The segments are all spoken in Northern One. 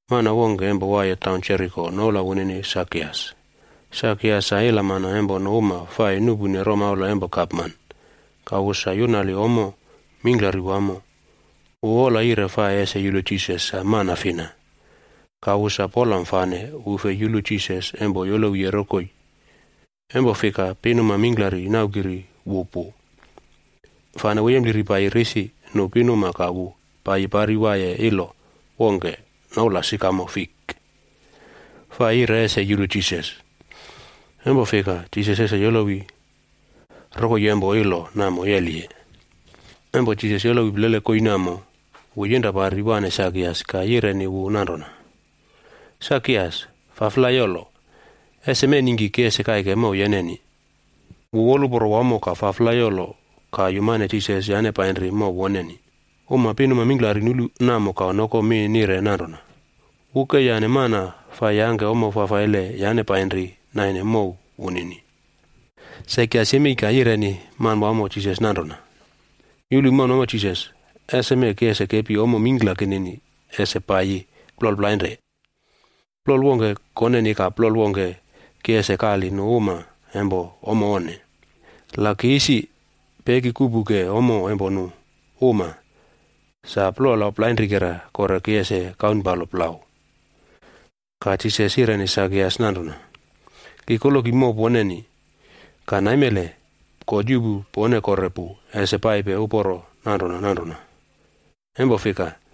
Mana wongke empo waiye taun Jeriko noula wunini Sakias. Sakias sa ilamana empo nu uma fai nuꞌpune romaula empo gapman, ka wu sa yunali ommo mingklari wamo. Wu wola yire fai ese yulu Jisas sa mana fina. Ka wu sa polam fane wu fei yulu Jisas empo yolowiye rokoi, empo fika pinuma mingklari naukiri wu pu. Fane wu yempliri paiyi risi nu pinuma ka wu paiyi pari waiye ilo wongke noula Sikamo Fik, fai yire ese yulu Jisas. Empo fika, Jisas ese yolowi rokoi empo ilo namo yeliye. Empo Jisas yolowi plele koii namo, wu yinra pari waꞌne Sakias ka yireni wu nanrona, “Sakias, faflai yolo. Eseme ningki ki ese kaike mow yeneni.” Wu woluporo wamo ka faflai yolo ka yumane Jisas yane painri mow woneni. Uma pinuma mingklari nulu namo ka noko mi nire nanrona, “Wu ke yane mana fai yangke nale fafaile yane painri naine mow wunini.” Sakias yemei ka yireni Manwamo Jisas nanrona, “Yulu, Manwamo Jisas! Eseme ki ese kepi ommo mingkla kinini ese paiyi plol plainre. Plol wongke koneni ka plol wongke ki ese kali nu uma empo ommo onne. La ki isi peki kuꞌpuke ommo empo nu uma, sa plola plainrikera kore ki ese kaunpalo plau.” Ka Jisas yireni Sakias nanrona, “Ki koloki mow poneni, ka naimele God yuꞌpu pone kore pu ese paipe uporo nanrona nanrona. Empo fika,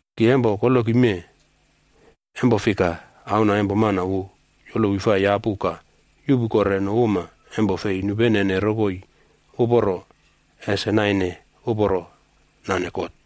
Ki empo koloki mee, empo fika, Auna empo Mana wu yolowi fai yapu ka yuꞌpu kore nu uma empo fei nupenene rokoi uporo ese naine uporo nane God.”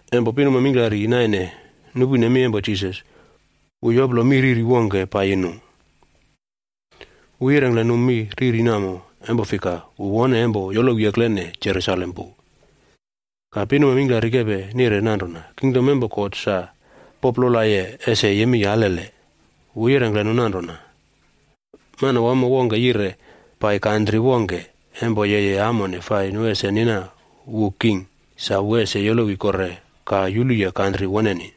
Empo pinuma mingklari naine nupune mi empo Jisas, wu yoplo mi riri wongke paiyi nu. Wu yirengkle nu mi riri namo, empo fika, wu wone empo yolowi eklene Jerusalem pu, ka pinuma mingklari kepe nire nanrona kingdom empo God sa poplolaye ese yemei alele. Wu yirengkle nu nanrona, “Manawamo wongke yire pai kantri wongke empo yeye amone fai nu ese nina wu king sa wu ese yolowi kore ka yuluye kantri woneni.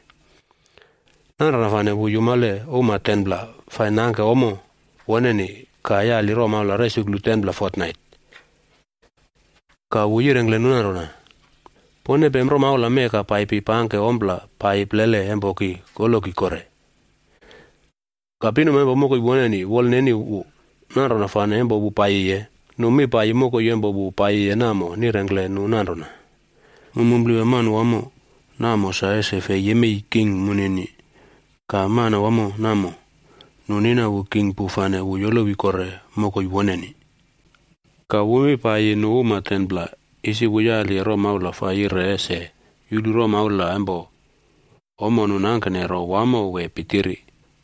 Nanrona fane wu yumale 10pla uma fai nangke ommo woneni ka yali romaula resuklu 10pla fotnait.b Ka wu yirengkle nu nanrona, ‘Pone pem romaula mee ka paipi pangke ompla paiyi plele empo ki koloki kore.’ “Ka pinuma empo mokoi woneni fa wolneni wu, nanrona fane empo wu paiyiye, nu mi paiyi mokoi empo wu paiyiye namo nirengkle nu nanrona, ‘Mu mumplewa manawamo namo sa ese fei yemei king munini.’ “Ka manawamo namo, nu nina wu king pu fane wu yolowi kore mokoi woneni. Ka wu mi paiyi nu uma 10pla, isi wu yaliye romaula fai yire ese yulu romaula empo ommo nu nangkene ro wamo wee pitiri.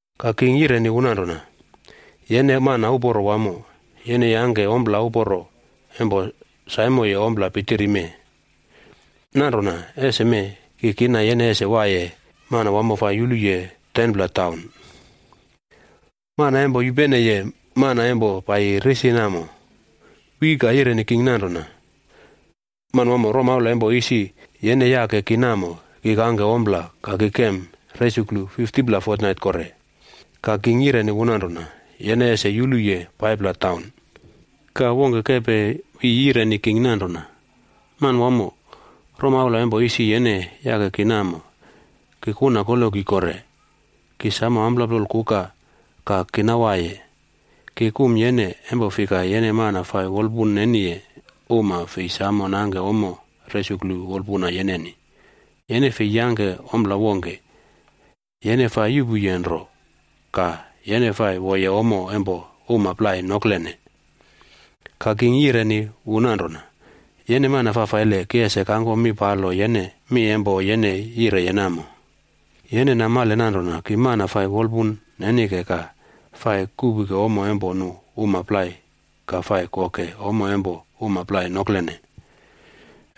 “Ka king yireni wu nanrona, ‘Yene mana uporo wamo, yene yangke ompla uporo empo saimoye ompla pitiri mee. Nanrona eseme, ki kina yene ese waiye manawamo fai ese yuluye 10pla taun.’ “Mana empo yupeneye mana empo paiyi risi namo, wi ka yireni king nanrona, ‘Manwamo, romaula empo isi yene yake ki namo, ki kangke ompla ka ki kem resuklu 50pla fotnait kore.’ “Ka king yireni wu nanrona, ‘Yene ese yuluye 5pla taun.’ “Ka wongke kepe wi yireni king nanrona, ‘Manwamo, romaula empo isi yene yake ki namo, ki kuna koloki kore. Ki samo amplap plola kuka ka kina waiye. Ki kum yene, empo fika yene mana fai wolpun neniye uma fei samo nangke ommo resuklu wolpuna yeneni. Yene fei yangke ompla wongke, yene fai yuꞌpuye nro ka yene fai woye ommo empo uma plai noklene.’ “Ka king yireni wu nanrona, ‘Yene mana fafaile, ki ese kangkom mi palo yene mi empo yene yireye namo. Yene namale nanrona ki mana fai wolpun nenike ka fai kuꞌpuke ommo empo nu uma plai ka fai koke ommo empo uma plai noklene.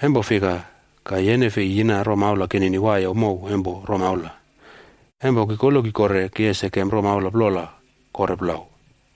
Empo fika ka yene fei yina romaula kinini waiye mow empo romaula, empo ki koloki kore, ki ese kem romaula plola kore plau?’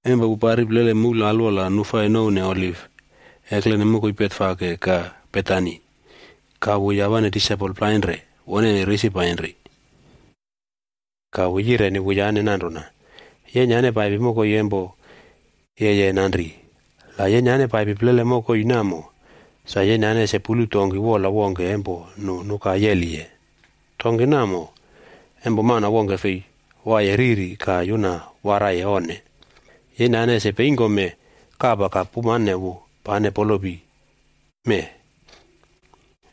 Empo wu pari plele moul alwola nu fai nouwne Oliv, eklene mokoi Betfage ka Betani, ka wu yawane disaipol plainre woneni risi painri. Ka wu yireni wuyane nanrona, “Yenyane paipi mokoi empo yeye nanri. La yenyane paipi plele mokoi namo, sa yenyane ese pulu donki wola wongke empo nu nuka yeliye. Donki namo, empo mana wongke fei waiye riri ka yuna waraiye onne. Yenyane ese peingkome kapa ka pumane wu pane polopi mee.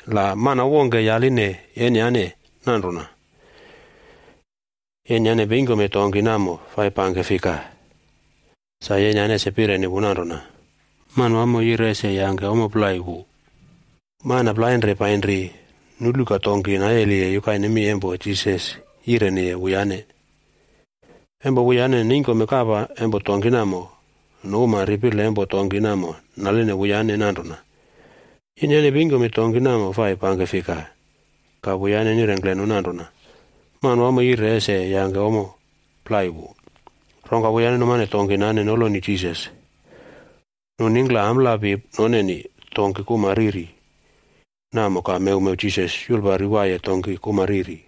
La mana wongke yaline yenyane nanrona, ‘Yenyane peingkome donki namo fai pangke fika?’ Sa yenyane ese pireni wu nanrona, ‘Manwamoc yire ese yangke ommo plai wu.’” Mana plainre painri, nulu ka donki nayeliye yukaine mi empo Jisas yireniye wuyane. Empo wuyane neingkome kapa empo donki namo, nu uma ripile empo donki namo naline wuyane nanrona, “Yenyane peingkome donki namo fai pangke fika?” Ka wuyane nirengkle nu nanrona, “Manwamo yire ese yangke ommo plai wu.” Rongka wuyane numane donki nane noloni Jisas. Nu ningkla amplapi noneni donki kuma riri namo ka mewmew Jisas yulpari waiye donki kuma riri.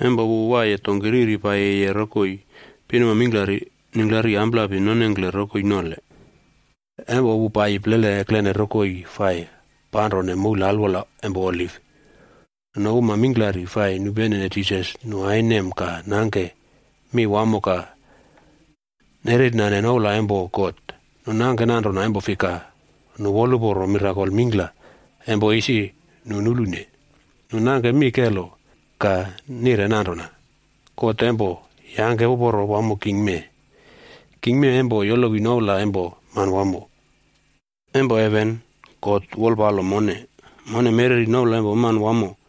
Empo wu waiye donki riri paiyiye rokoi, pinuma mingklari ningklari amplapi nonengkle rokoi nole. Empo wu paiyi plele eklene rokoi fai panrone moul alwola empo Oliv, nu uma mingklari fai nupene Jisas nu ainem ka nangke mi wamo ka nerernane noula empo God. Nu nangke nanrona empo fika nu woluporo mirakol mingkla empo isi nu nulune. Nu nangke mi kelo ka nire nanrona, “God empo yangke uporo wamo king mee. King mee empo yolowi noula empo Manwamo.”d “Empo heven God wolpalo mone. Mone mereri noula empo Manawamo,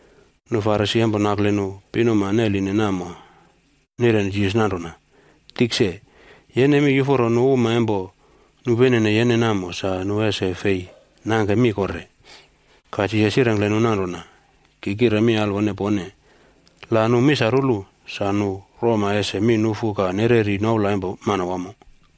Nu Farisi empo nakle nu pinuma neline namo nireni Jisas nanrona, “Tikse, yene mi yuforo nu uma empo nupenene yene namo sa nu ese fei nangke mi kore.” Ka Jisas yirengkle nu nanrona, “Ki kire mi alwone pone, la nu misarulu, sa nu roma ese mi nufu ka nereri noula empo Manwamo.”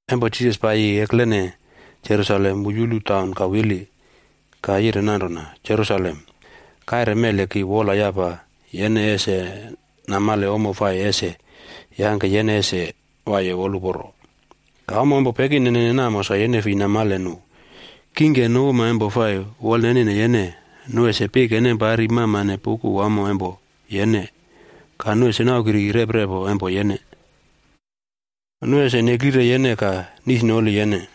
Empo Jisas paiyi eklene Jerusalem wu yulu taun ka wili. Ka yire nanrona, “Jerusalem, kaire mele ki wolyapa yene ese namale ommo fai ese yangke yene ese waiye woluporo. Ka ommo empo pekinenene namo sa yene fei namale nu. Kingke nu uma empo fai wolnenine yene, nu ese pike nem pari mamane puꞌku wamo empo yene. Ka nu ese naukiri reprepo empo yene. Nu ese neklire yene ka nisnoli yene.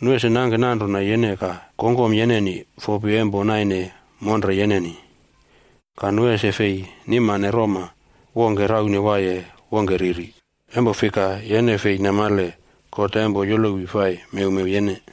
Nu ese nangke nanrona yene ka kongkom yeneni fopi empo naine monre yeneni. Ka nu ese fei nimane roma wongke raune wiye wongke riri, empo fika yene fei namale God empo yolowi fai mewmew yene.”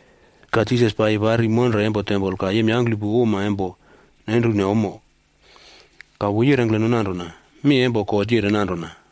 Ka Jisas paiyi pari monre empo tempol ka yemyangklupu uma empo nenrune ommo. Ka wu yirengkle nu nanrona, “Mi empo God yire nanrona,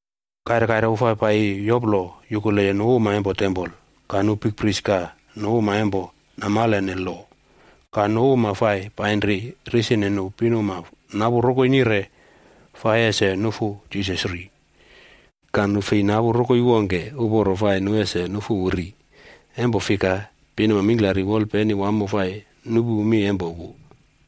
Kaire kaire wu fai paiyi yoplo yukuleye nu uma empo tempol. Ka nu bikprish ka nu uma empo namalene lo ka nu uma fai painri risine nu pinuma napu rokoi nire fai ese nufu Jisas ri. Ka nu fei napu rokoi wongke uporo fai nu ese nufu wu ri, empo fika pinuma mingklari wolpeni wamo fai nupu mi empo wu.